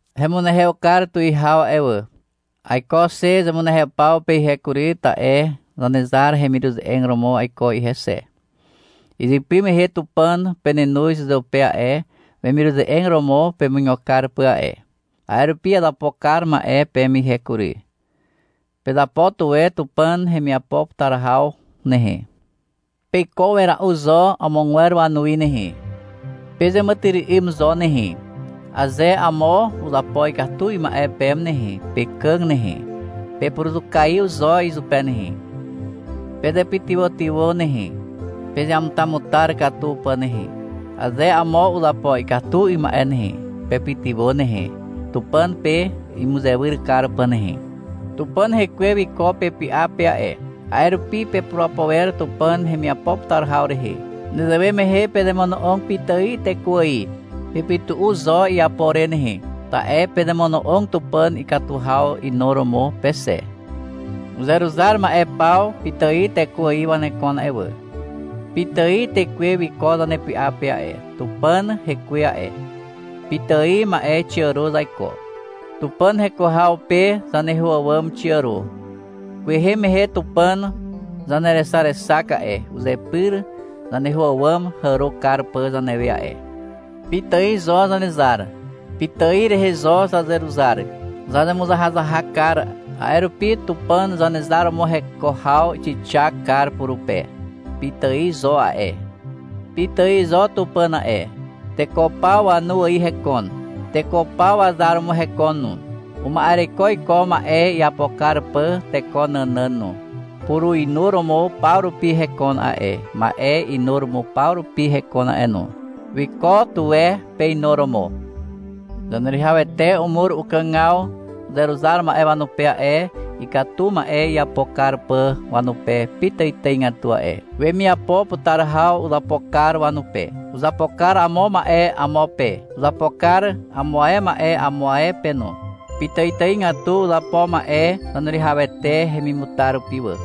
Hemunehew kar tuwihaw a'e wà. Aiko xe zemunehew paw pe ihe kury, ta'e Zanezar hemiruze'eg romo aiko ihe xe. Izypy mehe Tupàn penenoz uzeupe a'e, wemiruze'eg romo pemuigo kar pà a'e. A'e rupi azapo kar ma'e peme ihe kury. Pezapo tuwe Tupàn hemiapo putar haw nehe. Peiko wera'u zo amogwer wanuwi nehe. Pezeàmàtyry'ym zo nehe. Aze amo uzapo ikatu 'ym ma'e peme nehe, pekàg nehe, pepuruzukaiw zo izupe nehe. Pezepytywàtywà nehe, pezeamutamutar katu pà nehe. Aze amo uzapo ikatu 'ym ma'e nehe, pepytywà nehe, Tupàn pe imuzewyr kar pà nehe. Tupàn Hekwe wiko pepy'a pe a'e. A'e rupi pepurapo wer Tupàn hemiapo putar haw rehe. Nezewe mehe pezemono'og pitài teko ài. Pepytu'u zo iapo re nehe. Ta'e pezemono'og Tupàn ikatu haw inuromo pe xe. Uzeruzar ma'e paw pitài teko ài wanekon a'e wà. Pitài tekwe wiko zanepy'a pe a'e, Tupàn Hekwe a'e. Pitài ma'e xiàro zaiko. Tupàn heko haw pe zaneho àwàm xiàro. Kwehe mehe Tupàn zanerexarexak a'e, uzepyr zaneho àwàm hàro kar pà zanewe a'e. Pitài zo Zanezar. Pitài rehe zo zazeruzar. Zazemuzahazahak kar, a'e rupi Tupàn Zanezar romo heko haw xixak kar purupe. Pitài zo a'e. Pitài zo Tupàn a'e. Teko paw wanu ài hekon. Teko paw wazar romo hekon no. Uma'ereko iko, ma'e iapo kar pà teko nànàn no. Puruinuromo paw rupi hekon a'e, ma'e inuromo paw rupi hekon a'e no. Wiko tuwe peinuromo. Zaneruwihawete umur ukàgaw uzeruzar ma'e wanupe a'e, ikatu ma'e iapo kar pà wanupe pitàitàigatu a'e. Wemiapo putar haw uzapo kar wanupe. Uzapo kar amo ma'e amo pe. Uzapo kar amo ae ma'e amo ae pe no. Pitàitàigatu uzapo ma'e Zaneruwihawete hemimutar rupi wà.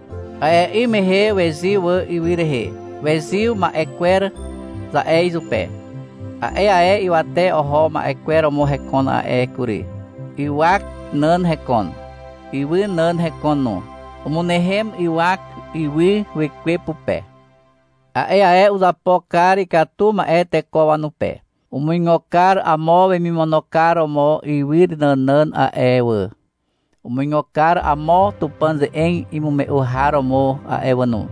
A'e 'ym mehe wezyw wà ywy rehe. — Wezyw ma'e kwer, za'e izupe. A'e ae ywate oho ma'e kwer romo hekon a'e kury. Ywak nàn hekon. Ywy nàn hekon no. Umynehem ywak ywy Wekwe pupe. A'e ae uzapo kar ikatu ma'e teko wanupe. Umuigo kar amo wemimono kar romo ywy nànàn a'e wà. Umuigo kar amo Tupàn ze'eg imume'u har romo a'e wà no.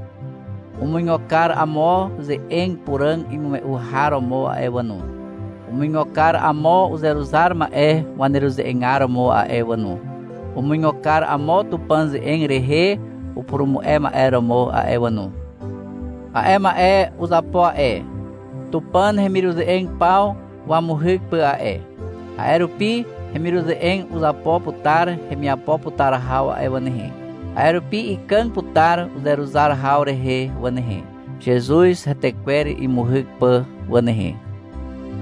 Umuigo kar amo ze'eg puràg imume'u har romo a'e wà no. Umuigo kar amo uzeruzar ma'e waneruze'egar romo a'e wà no. Umuigo kar amo Tupàn ze'eg rehe upurumu'e ma'e romo a'e wà no. A'e ma'e uzapo a'e, Tupàn hemiruze'eg paw wamuhyk pà a'e. A'e rupi hemiruze'eg uzapo putar hemiapo putar haw a'e wà nehe. A'e rupi ikàg putar uzeruzar haw rehe wà nehe, Zezuz hetekwer imuhyk pà wà nehe.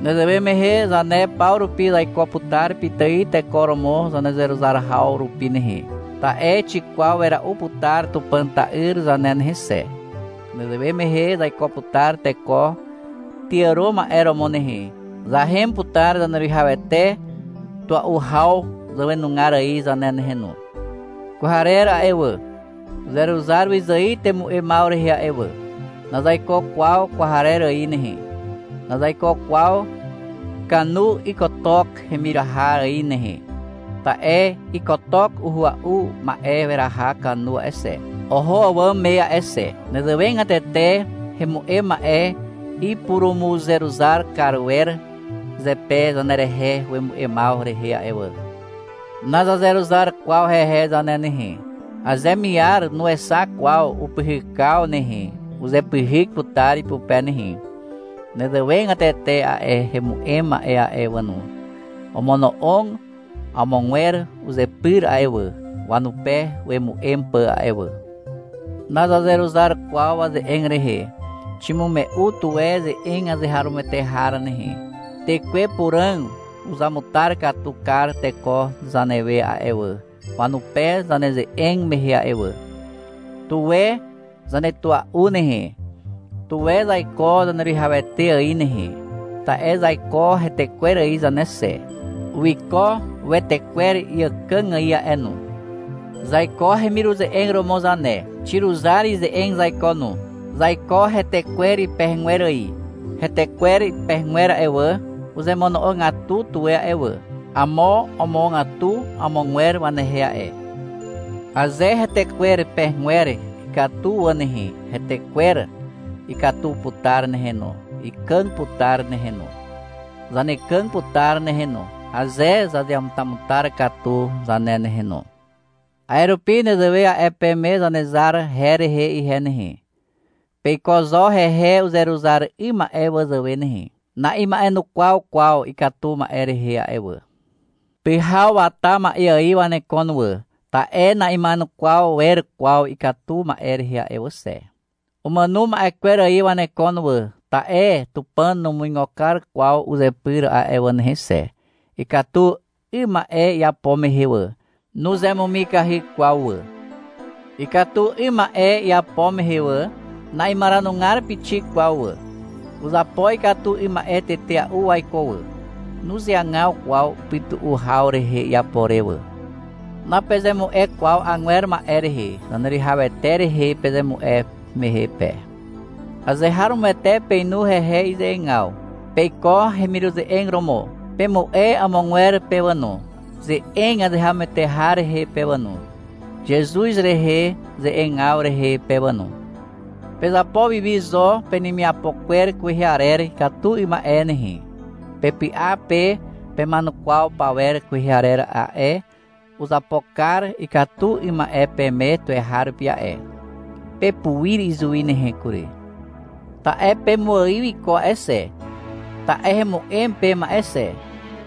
Nezewe mehe zane paw rupi zaiko putar pitài teko romo zanezeruzar haw rupi nehe. Ta'e xikwaw wera'u putar Tupàn Ta'yr zane nehe xe. Nezewe mehe zaiko putar teko tyàro ma'e romo nehe, zahem putar Zaneruwihawete tua'u haw zàwenugar ài zane nehe no. Kwarer a'e wà, uzeruzar wyzài temu'emaw rehe a'e wà. Nazaiko kwaw kwarer ài nehe. Nazaiko kwaw kanu ykotok hemiraha ài nehe. Ta'e ykotok uhua'u ma'e weraha kanu a'e xe, oho àwàm me a'e xe. Nezewegatete hemu'em ma'e ipurumuzeruzar kar wer zepe zanerehe wemu'emaw rehe a'e wà. Nazazeruzar kwaw hehe zane nehe. Aze miar nuexak kwaw upyhykaw nehe, uzepyhyk putar ipupe nehe. Nezewegatete a'e hemu'em ma'e a'e wà no, omono'og amogwer uzepyr a'e wà, wanupe wemu'em pà a'e wà. Nazazeruzar kwaw waze'eg rehe. Ximume'u tuwe ze'eg azeharomoete har nehe. Tekwe Puràg uzamutar katu kar teko zanewe a'e wà, wanupe zaneze'eg mehe a'e wà. Tuwe zanetua'u nehe. Tuwe zaiko Zaneruwihawete ài nehe. Ta'e zaiko hetekwer ài zane xe. Wiko wetekwer iàkàg ài a'e no. Zaiko hemiruze'eg romo zane. Xiruzar ize'eg zaiko no. Zaiko hetekwer pegegwer ài. Hetekwer pegegwer a'e wà, uzemono'ogatu tuwe a'e wà. Amo omogatu amogwer wanehe a'e. Aze hetekwer pegegwer ikatu wà nehe, hetekwer ikatu putar nehe no, ikàg putar nehe no. Zanekàg putar nehe no, aze zazeamutamutar katu zane nehe no. A'e rupi nezewe a'e peme Zanezar her rehe ihe nehe. Peiko zo hehe uzeruzar 'ym ma'e wazàwe nehe. Na'ima'enukwaw kwaw ikatu ma'e rehe a'e wà. Pyhaw wata ma'e ài wanekon wà, ta'e na'ima'enukwaw wer kwaw ikatu ma'e rehe a'e wà xe. Umàno ma'e kwer ài wanekon wà, ta'e Tupàn numuigo kar kwaw uzepyr a'e wà nehe xe. Ikatu 'ym ma'e iapo mehe wà, nuzemumikahy kwaw wà. Ikatu 'ym ma'e iapo mehe wà, na'imaranugar pixik kwaw wà. Uzapo ikatu 'ym ma'e tetea'u waiko wà. Nuzeagaw kwaw upytu'u haw rehe iapo re wà. Napezemu'e kwaw agwer ma'e rehe, Zaneruwihawete rehe pezemu'e mehe pe. Azeharomoete peinu hehe ize'egaw. Peiko hemiruze'eg romo. Pemu'e amogwer pe wà no, ze'eg azeharomoete har rehe pe wà no, Zezuz rehe ze'egaw rehe pe wà no. Pezapo wi wi zo penemiapo kwer kwehe arer ikatu 'ym ma'e nehe. Pepy'a pe pema'enukwaw pawer kwehe arer a'e, uzapo kar ikatu 'ym ma'e peme tuweharupi a'e. Pepuir izuwi nehe kury. Ta'e pemuaiw iko a'e xe. Ta'e hemu'em peme a'e xe,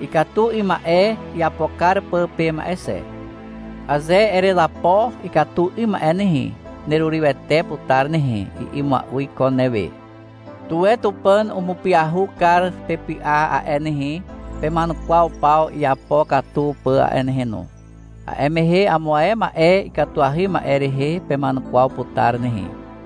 ikatu 'ym ma'e iapo kar pà peme a'e xe. — Aze erezapo ikatu 'ym ma'e nehe, nerurywete putar nehe, i'i mua'u iko newe. Tuwe Tupàn umupyahu kar pepy'a a'e nehe, pema'enukwaw paw iapo katu pà a'e nehe no. (A'e mehe amo ae ma'e ikatuahy ma'e rehe pema'enukwaw putar nehe.)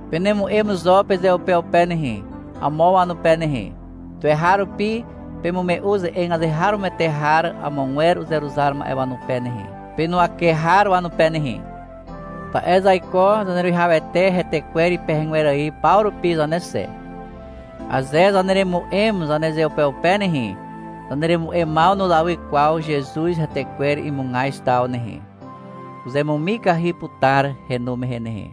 Penemu'em zo pezeupeupe nehe, amo wanupe nehe. Tuweharupi pemume'u ze'eg azeharomoete har amogwer uzeruzar ma'e wanupe nehe, penuwake har wanupe nehe. Ta'e zaiko Zaneruwihawete hetekwer ipegegwer ài paw rupi zane xe. Aze zaneremu'em zanezeupeupe nehe, zaneremu'emaw nuzawy kwaw Zezuz hetekwer imugaz taw nehe. Uzemumikahy putar henu mehe nehe.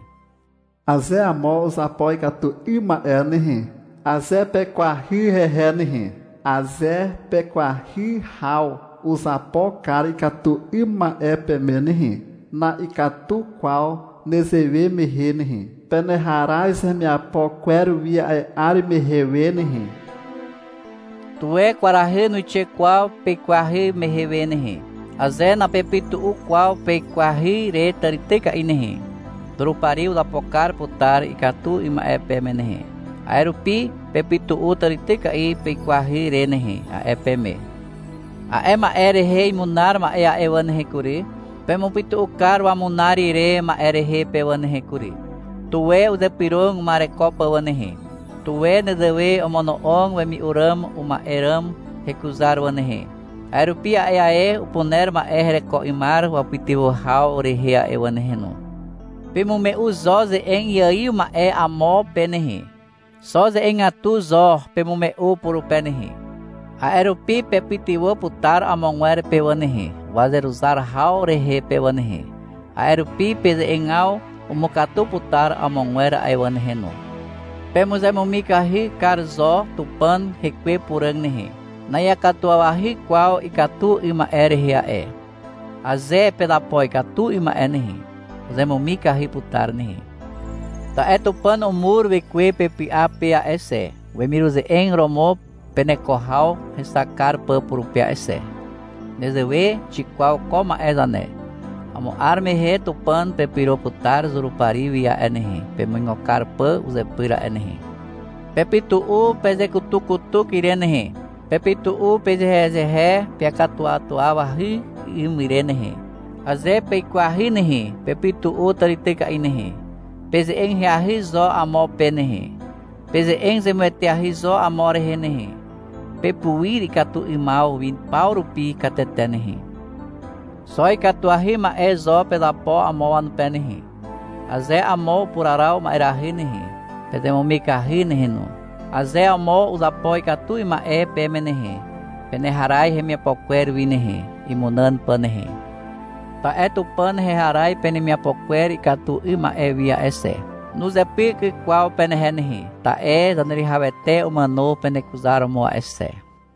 Aze amo uzapo ikatu 'ym ma'e nehe, aze peikwahy hehe nehe, aze pekwahy haw uzapo kar ikatu 'ym ma'e peme nehe, na'ikatu kwaw nezewe mehe nehe. Peneharaz hemiapo kwer wi a'e 'ar mehe we nehe. Tuwe kwarahy nuixe kwaw pekwahy mehe we nehe. Aze napepytu'u kwaw peikwahy re tàrityka'i nehe, Zurupari uzapo kar putar ikatu 'ym ma'e peme nehe. A'e rupi, — Pepytu'u tàrityka'i peikwahy re nehe, a'e peme. A'e ma'e rehe imunar ma'e a'e wà nehe kury, pemupytu'u kar wamunar ire ma'e rehe pe wà nehe kury. Tuwe uzypyrog uma'ereko pà wà nehe. Tuwe nezewe omono'og wemi'u ràm uma'e ràm hekuzar wà nehe. A'e rupi a'e ae upuner ma'e hereko 'ymar wapytywà haw rehe a'e wà nehe no. Pemume'u zo ze'eg iaiw ma'e amo pe nehe. Xo ze'egatu zo pemume'u purupe nehe. A'e rupi pepytywà putar amogwer pe wà nehe, wazeruzar haw rehe pe wà nehe. A'e rupi peze'egaw umukatu putar amogwer a'e wà nehe no. Pemuzemumikahy kar zo Tupàn Hekwe Puràg nehe. Na'iakatuwawahy kwaw ikatu 'ym ma'e rehe a'e. Aze pezapo ikatu 'ym ma'e nehe, uzemumikahy putar nehe. Ta'e Tupàn umur Wekwe pepy'a pe a'e xe, wemiruze'eg romo peneko haw hexak kar pà purupe a'e xe. Nezewe xikwaw ko ma'e zane. Amo 'ar mehe Tupàn pepyro putar Zurupari wi a'e nehe, pemuigo kar pà uzepyr a'e nehe. Pepytu'u pezekutukutuk ire nehe. Pepytu'u pezehezehe peakatuwatuawahy 'ym ire nehe. Aze peikwahy nehe, pepytu'u tàrityka'i nehe. Peze'eg ahyahy zo amo pe nehe. Peze'eg zemueteahy zo amo rehe nehe. Pepuir ikatu 'ymaw wi paw rupi katete nehe. Xo ikatuahy ma'e zo pezapo amo wanupe nehe. Aze amo upuraraw ma'erahy nehe, pezemumikahy nehe no. Aze amo uzapo ikatu 'ym ma'e peme nehe, peneharaz hemiapo kwer wi nehe, imunàn pà nehe. Ta'e Tupàn heharaz penemiapo kwer ikatu 'ym ma'e wi a'e xe. Nuzepyk kwaw penehe nehe, ta'e Zaneruwihawete umàno penekuzaromo a'e xe.